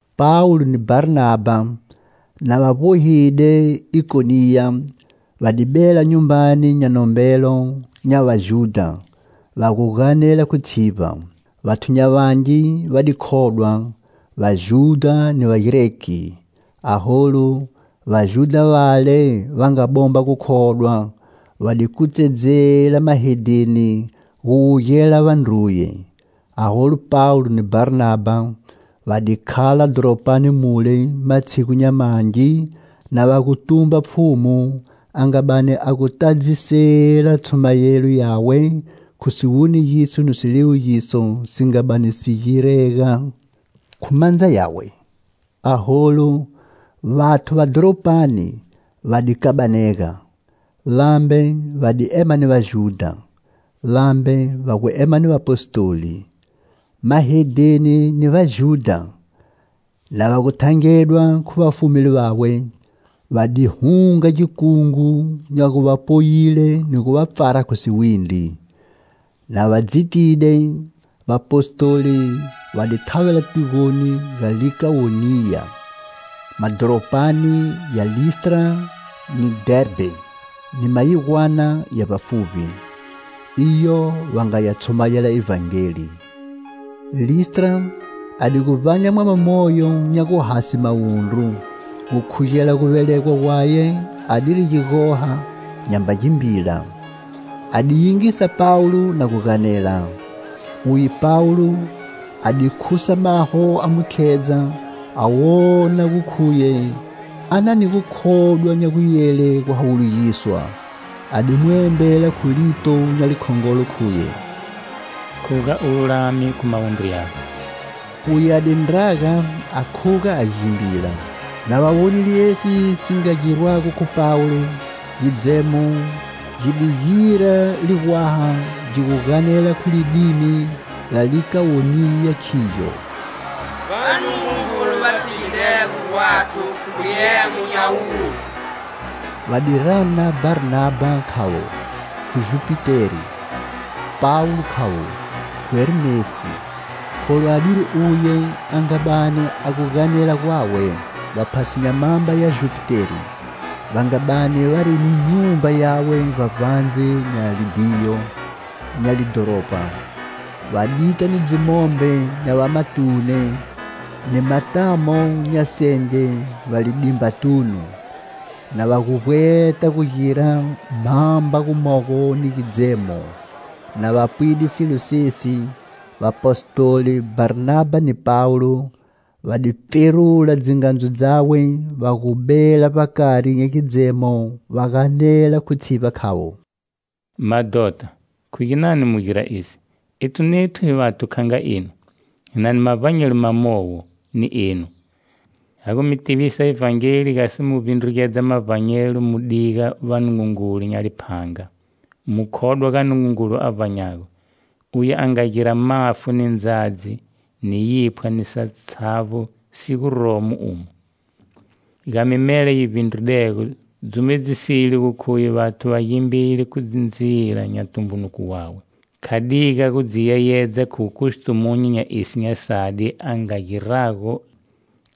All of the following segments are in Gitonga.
Pawulo ni Bharnabha, na va vbohide Ikoniya, va di bela nyumbani nya nombelo nya Vajudha, va gu ganela khu tshivba. Vathu nya vangi va di khodwa, Vajudha ni Vagreki. Aholu, Vajudha vale va nga bomba gukhodwa, va di kutsedzela mahedheni gu wugela vandruye. Aholu Pawulo ni Bharnabha va di khala dhoropani mule matshigu nya mangi, na va gu tumba Pfhumu, a nga bani a gu tadzisela tshumayelo yawe khu siwonegiso ni siliwugiso si nga bani si girega khu mandza yawe. Aholu, vathu va dhoropani va di kabanega. Vambe va di ema ni Vajudha, vambe va gu ema ni vapostoli. Mahedheni ni Vajudha na va gu thangedwa khu vafumeli vawe, va di hunga gikungu nya gu va poyile ni gu va pfara khu siwindri. Na va dzitide, vapostoli va di thavela tigoni ga Likawoniya, madhoropani ya Listra ni Dherbhe, ni mayigwana ya vbafuvbi. Iyo va nga ya tshumayela Ivhangeli. Listra a di gu vbanya mwama moyo nya guhase mawundru, gukhugela guvelegwa gwaye adiri gigoha, nyamba gimbila. A di yingisa Pawulo na gu ganela. Uye Pawulo a di khusa maho a mu khedza a wona gu khuye a na ni gukhodwa nya guyele guhawulugiswa, a di mu embela khu lito nya likhongolo khuye: "Khuga u lulame khu mawundru yago." Uye a di ndraga a khuga a gimbila. Na va wonile esi si nga girwago khu Pawulo, gidzemo gi di gira ligwaha gi gu ganela khu lidimi la Likawoniya khigyo: "Vanungungulu va tshigidego gwathu khu giemo nya wuthu" Va di rana Bharnabha khavo khu Jupiteri, Pawulo khavo khu Hermesi kholu adiri uye a nga bani a gu ganela gwawe. Vaphasi nya mhamba ya Jupiteri va nga bani vari ni nyumba yawe vbavbandze nya libhiyo nya lidhoropa, va dita ni dzimombe nya vamatune ni matamo nya senge vbalidimbatunu, na va gu vbweta gu gira mhamba gumogo ni gidzemo. Na va pwide silo sesi, vapostoli Bharnabha ni Pawulo, va di pferula dzingandzu dzawe va gu bela vbakari nya gidzemo va ganela khu tshivba khavo: "Madhota, khu ginani mu gira esi! Ethu nethu hi vathu kha nga enu, hi na ni mavbanyelo mamowo ni enu, ha gu mi tivisa Ivhangeli gasi mu vbindrugedza mavbanyelo mu gu diga vanungungulu nya liphanga, mu khodwa ga Nungungulu a vbanyago, Uye a nga gira mafu ni ndzadzi, ni yiphwa ni satshavbo si guromo umo. Ga mimela yi vbindridego dzumedzisile gu khuye vathu va gimbile khu dzindzila nya tumbunuko wawe; Kha diga gu dzi yeyedza khu wukustumunyu nya esi nya sadi a nga girago;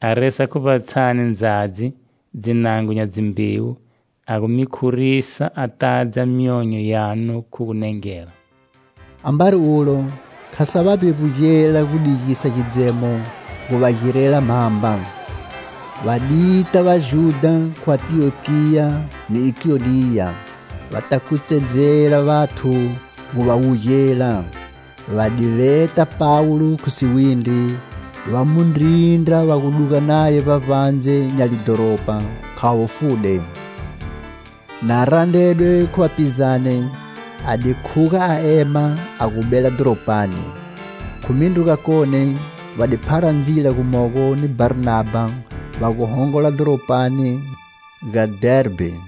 a resa khu vbatshani ndzadzi, ndzinango nya dzimbewu, a gu mi khurisa, a tadza myonyo yanu khu gunengela." Ambari ulo, kha sa va vbevbugela gu digisa gidzemo gu va girela mhamba. Va di ta Vajudha khu Antiyokiya ni Ikoniya va ta kutsedzela vathu gu va wugela. Va di veta Pawulo khu siwindri, va mu ndrindra va gu duga naye vbavbandze nya lidhoropa khavo fude. Na randredwe khu vapizane, a di khuga a ema a gu bela dhoropani. Khu mindru gakone va di phara ndzila gumogo ni Bharnabha va gu hongola dhoropani ga Dherbhe.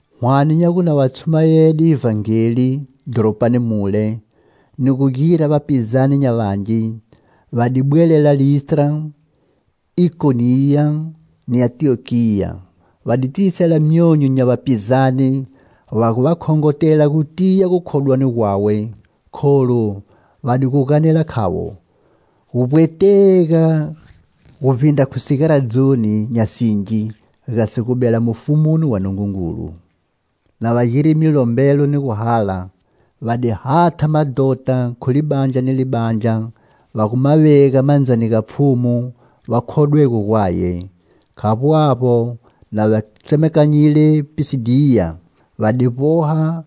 Hwane nya gu na va tshumayede Ivhangeli dhoropani mule, ni gu gira vapizane nya vangi, va di bwelela Listra, Ikoniya ni Antiyokiya. Va di tiyisela myonyo nya vapizane, va gu va khongotela gu tiya gukhodwani gwawe, kholu, va di gu ganela khavo: "Gu vbwetega guvbindra khu sigaradzoni nya singi gasi gu bela Mufumoni wa Nungungulu." Na va girile milombelo ni gu hala, va di hatha madhota khu libandla ni libandla va gu ma vega mandzani ga Pfhumu va khodwego gwaye. Khavbo avbo, na va tsemakanyile Pisidiya, va di vboha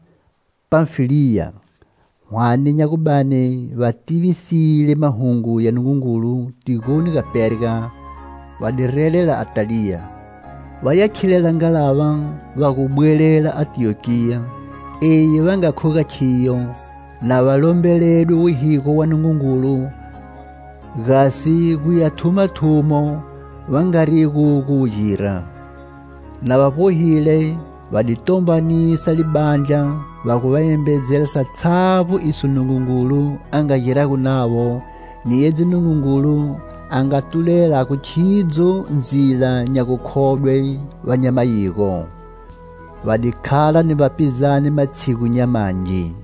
Panfiliya. Hwane nya gu bani va tivisile mahungu ya Nungungulu tigoni ga Perga, va di relela Ataliya, va ya khilela ngalava va gu bwelela Antiyokiya, eyi va nga khuga khiyo, na va lombeledwe wuhigo wa Nungungulu gasi gu ya thuma thumo va nga rigu gu wu gira. Na va vbohile, va di tombanisa libandla va gu va embedzela satshavbo iso Nungungulu a nga girago navo, ni edzi Nungungulu a nga tulelago khidzo ndzila nya gukhodwe va nya mayigo. Va di khala ni vapizane matshigu nya mangi.